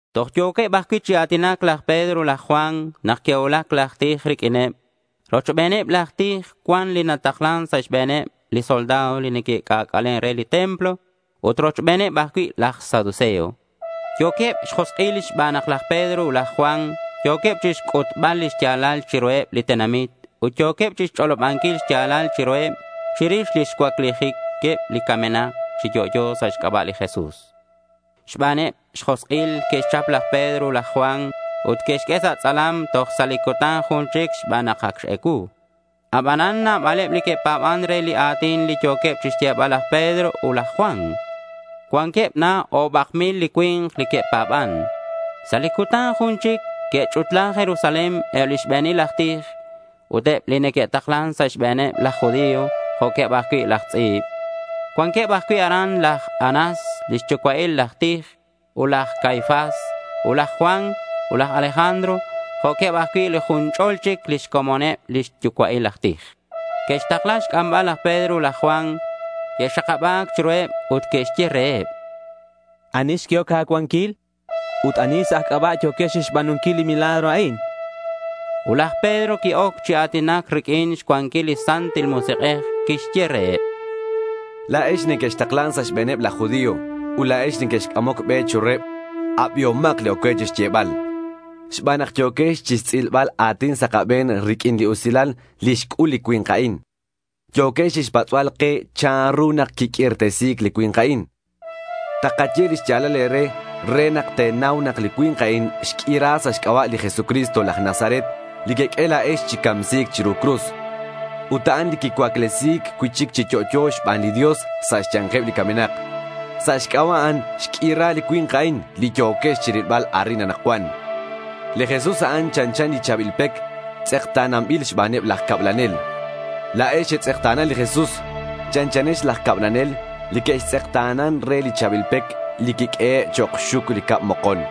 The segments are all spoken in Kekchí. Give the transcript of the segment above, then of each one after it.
Toj yo̱queb ajcui' chi a̱tinac laj Pedro ut laj Juan nak que'cuulac laj tij riq'uineb. Rochbeneb laj tij cuan li nataklan sa' xbe̱neb li soldado li neque'c'ac'alen re li templo ut rochbeneb ajcui' laj saduceo. Yo̱queb xjosk'il xban nak laj Pedro ut laj Juan yo̱queb chixc'utbal li xya̱lal chiruheb li tenamit ut yo̱queb chixch'olobanquil xya̱lal chiruheb chirix lix cuaclijiqueb li camenak chi yo'yo sa' xc'aba' li Jesús. Xbaneb xjosk'il que'xchap laj Pedro ut laj Juan ut que'xq'ue sa' tz'alam toj sa' li cutan jun chic xban nak ac x-ecuu. Abanan nabaleb li que'pa̱ban re li a̱tin li yo̱queb chixyebal laj Pedro ut laj Juan. Cuanqueb na o̱bak mil li cui̱nk li que'pa̱ban. Sa' li cutan jun chic que'ch'utla Jerusalén eb li xbe̱nil aj tij, ut eb li neque'taklan sa' xbe̱neb laj judío, jo'queb ajcui' laj tz'i̱b. Cuanqueb ajcui' aran laj Anás li xyucua'il laj tij, ut laj Caifás, ut laj Juan, ut laj Alejandro jo'queb ajcui' li jun ch'ol chic lix comoneb li xyucua'il aj tij. Que'xtakla xc'ambal laj Pedro ut laj Juan. Que'xakaba̱c chiruheb ut que'xye reheb: —¿Ani xq'uehoc e̱cuanquil? Ut, ¿ani sa' aj c'aba' yo̱quex chixba̱nunquil li milagro a'in? chanqueb. Ut laj Pedro qui-oc chi a̱tinac riq'uin xcuanquil li Santil Musik'ej ut quixye reheb: —La̱ex li nequextaklan sa' xbe̱neb laj judío ut la̱ex li nequexc'amoc be chiruheb, abihomak li oc cue xyebal, xban nak yo̱quex chixtz'ilbal a̱tin sa' kabe̱n riq'uin li usilal li xc'ul li cui̱nk a'in. Yo̱quex chixpatz'bal ke chanru nak quiq'uirtesi̱c li cui̱nk a'in. Takaye li xya̱lal e̱re re nak te̱nau nak li cui̱nk a'in xq'uira sa' xc'aba' li Jesucristo laj Nazaret li queq'ue la̱ex chi camsi̱c chiru cruz. Ut a'an li quicuaclesi̱c cui'chic chi yo'yo xban li Dios sa' xya̱nkeb li camenak. Sa' xc'aba' a'an xq'uira li cui̱nk a'in li yo̱quex chirilbal arin anakcuan. Li Jesús a'an chanchan li cha̱bil pec tz'ekta̱nanbil xbaneb laj cablanel. La̱ex xetz'ekta̱na li Jesús. Chanchanex laj cablanel li que'tz'ekta̱nan re li cha̱bil pec li quiq'uehe' chok' xxuc li cab mokon.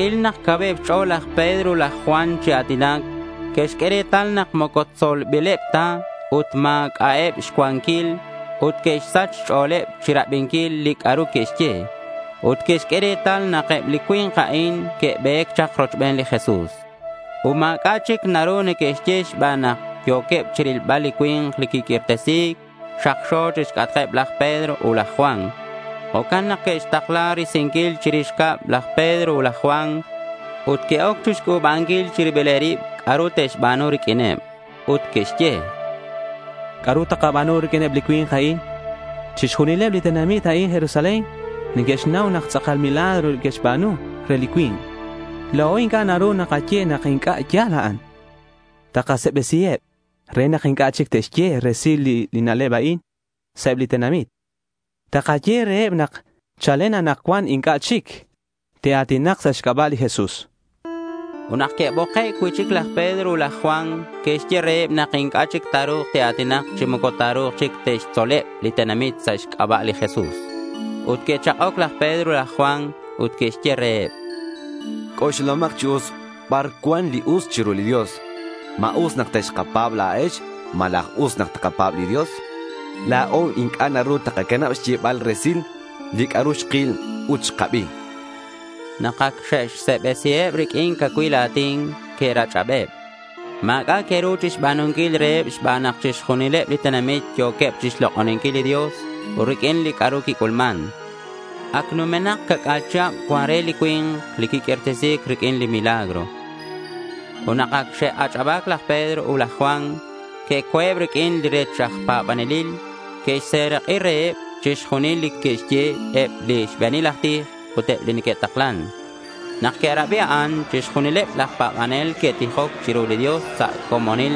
Que'ril nak cauheb xch'o̱l laj Pedro ut laj Juan chi a̱tinac. Que'xq'ue retal nak moco tzolbileb ta ut ma̱c'a'eb xcuanquil. Ut que'xsach xch'o̱leb chirabinquil li c'a'ru que'xye. Ut que'xq'ue retal nak eb li cui̱nk a'in que'be̱c chak rochben li Jesús. Ut ma̱c'a' chic naru neque'xye xban nak yo̱queb chirilbal li cui̱nk li quiq'uirtesi̱c xakxo chixc'atkeb laj Pedro ut laj Juan. Jo'can nak que'xtakla risinquil chirix cab laj Pedro ut laj Juan. Ut que'oc chixc'u̱banquil chi ribileb rib c'a'ru te'xba̱nu riq'uineb. Ut que'xye: —¿C'a'ru takaba̱nu riq'uineb li cui̱nk a'in? Chixjunileb li tenamit arin Jerusalén neque'xnau nak tz'akal milagro que'xba̱nu re li cui̱nk. La̱o inc'a' naru takaye nak inc'a' ya̱l a'an. Takase'besiheb re nak inc'a' chic te'xye resil li na'leb a'in sa' eb li tenamit. Takaye reheb nak chalen anakcuan inc'a' chic te'a̱tinak sa' xc'aba' li Jesús, chanqueb. Ut nak que'boke' cui'chic laj Pedro ut laj Juan, que'xye reheb nak inc'a' chic ta̱ru̱k te'a̱tinak chi moco ta̱ru̱k chic te'xtzoleb li tenamit sa' xc'aba' li Jesús. Ut que'chak'oc laj Pedro ut laj Juan ut que'xye reheb: —C'oxlahomak chi us bar cuan li us chiru li Dios. ¿Ma us nak texkapa̱b la̱ex malaj ut us nak takapa̱b li Dios? La̱o inc'a' naru takacanab xyebal resil li c'a'ru xkil ut xkabi, chanqueb. Nak ac xe'xse'besiheb riq'uin cacuil a̱tin, que'rach'abeb. Ma̱c'a' que'ru xba̱nunquil reheb xban nak chixjunileb li tenamit yo̱queb chixlok'oninquil li Dios riq'uin li c'a'ru quic'ulman. Ac numenak ca'c'a̱l chihab cuan re li cui̱nk li quiq'uirtesi̱c riq'uin milagro. Ut nak ac xe'ach'aba̱c laj Pedro ut laj Juan, que'co̱eb riq'uineb li rech aj pa̱banelil. Que'xserak'i reheb chixjunil li que'xye eb li xbe̱nil aj tij ut eb li neque'taklan. Nak que'rabi a'an, chixjunileb laj pa̱banel que'tijoc chiru li Dios sa' comonil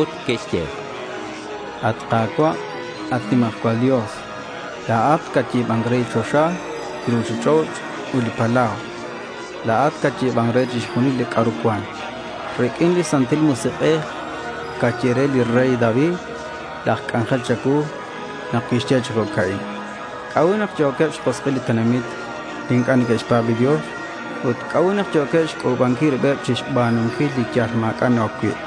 ut que'xye: —At Ka̱cua' at nimajcual Dios, la̱at catyi̱ban re li choxa, li ruchich'och', ut li palau. La̱at catyi̱ban re chixjunil li c'a'ru cuan. Riq'uin li Santil Musik'ej caye re li rey David laj c'anjel cha̱cuu nak tixye chi jo'ca'in: ¿C'a'ut nak yo̱queb xjosk'il li tenamit li inc'a' neque'xpa̱b li Dios? Ut, ¿c'a'ut nak yo̱queb xc'u̱banquil ribeb chixba̱nunquil li yal ma̱c'a' na-oc cui'?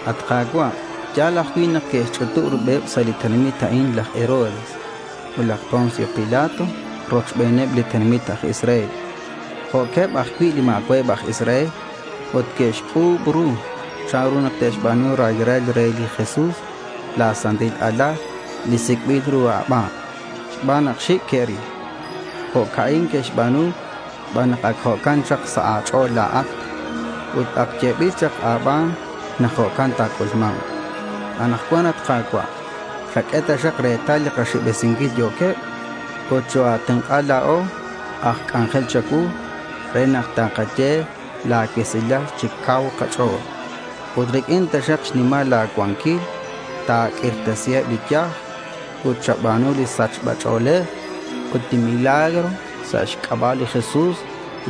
At Ka̱cua', ya̱l ajcui' nak que'xch'utub ribeb sa' li tenamit a'in laj Herodes ut laj Poncio Pilato rochbeneb li tenamit aj Israel jo'queb ajcui' li ma̱cua'eb aj Israel ut que'xc'u̱b ru chanru nak te'xba̱nu raylal re li Jesús la̱ Santil Alal li sic'bil ru a̱ban xban nak xic' que'ril. Jo'ca'in que'xba̱nu xban nak ac jo'can chak sa' a̱ch'o̱l la̱at. Ut ac yebil chak a̱ban nak jo'can ta̱c'ulma̱nk. Ut anakcuan, at Ka̱cua', chaq'ue taxak retal li kase'besinquil yo̱queb, ut choa̱tenk'a la̱o aj c'anjel cha̱cuu re nak takaye la̱ cuesilal chi cau kach'o̱l. Ut riq'uin taxak xnimal la̱ cuanquil, ta̱q'uirtesiheb li yaj ut chaba̱nu li sachba ch'o̱lej ut milagro sa' xc'aba' li Jesús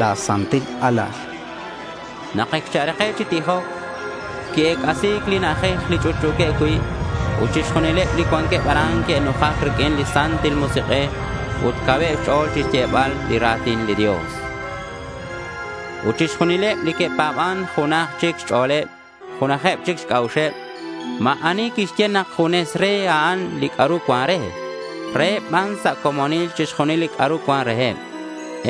la̱ Santil Alal, chanqueb sa' lix tijeb. Nak ac xe'rake' chi tijoc, qui-ec'asi̱c li na'ajej li ch'utch'u̱queb cui'. Ut chixjunileb li cuanqueb aran que'nujac riq'uin li Santil Musik'ej. Ut cauheb xch'o̱l chixyebal li ra̱tin li Dios. Ut chixjunileb li que'pa̱ban junajeb chic xch'o̱leb ut junajeb chic xc'a'uxeb. Ut ma̱ ani quixye nak junes re a'an li c'a'ru cuan re. Reheb ban sa' comonil chixjunil li c'a'ru cuan reheb.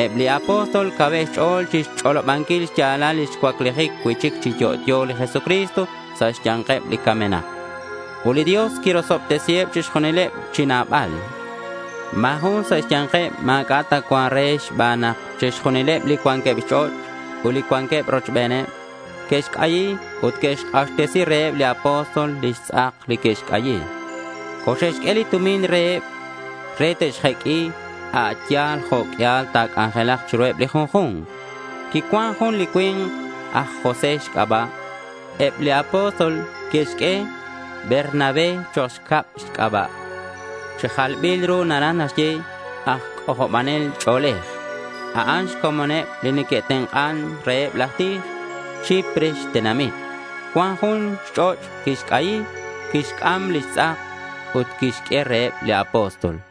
Eb li apóstol cauheb xch'o̱l chixch'olobanquil xya̱lal lix cuaclijic cui'chic chi yo'yo li Jesucristo sa' xya̱nkeb li camenak. Ut li Dios quirosobtesiheb chixjunileb chi nabal. Ma̱ jun sa' xya̱nkeb ma̱c'a' ta cuan re xban nak chixjunileb li cuanqueb xch'och' ut li cuanqueb rochocheb que'xc'ayi ut que'xk'axtesi reheb li apóstol lix tz'ak li que'xc'ayi. Coxe'xq'ue li tumin reheb re te'xjeq'ui a' yal jo' q'uial ta̱c'anjelak chiru li junju̱nk. Quicuan jun li cui̱nk aj José xc'aba'. Eb li apóstol que'xq'ue Bernabé chok' xcab xc'aba'. Chi jalbil ru naraj naxye “Aj C'ojobanel Ch'o̱lej”. A'an xcomoneb li neque'tenk'an reheb laj tij. Chipre xtenamit. Cuan jun xch'och' quixc'ayi. Quixc'am lix tz'ak ut quixq'ue reheb li apóstol.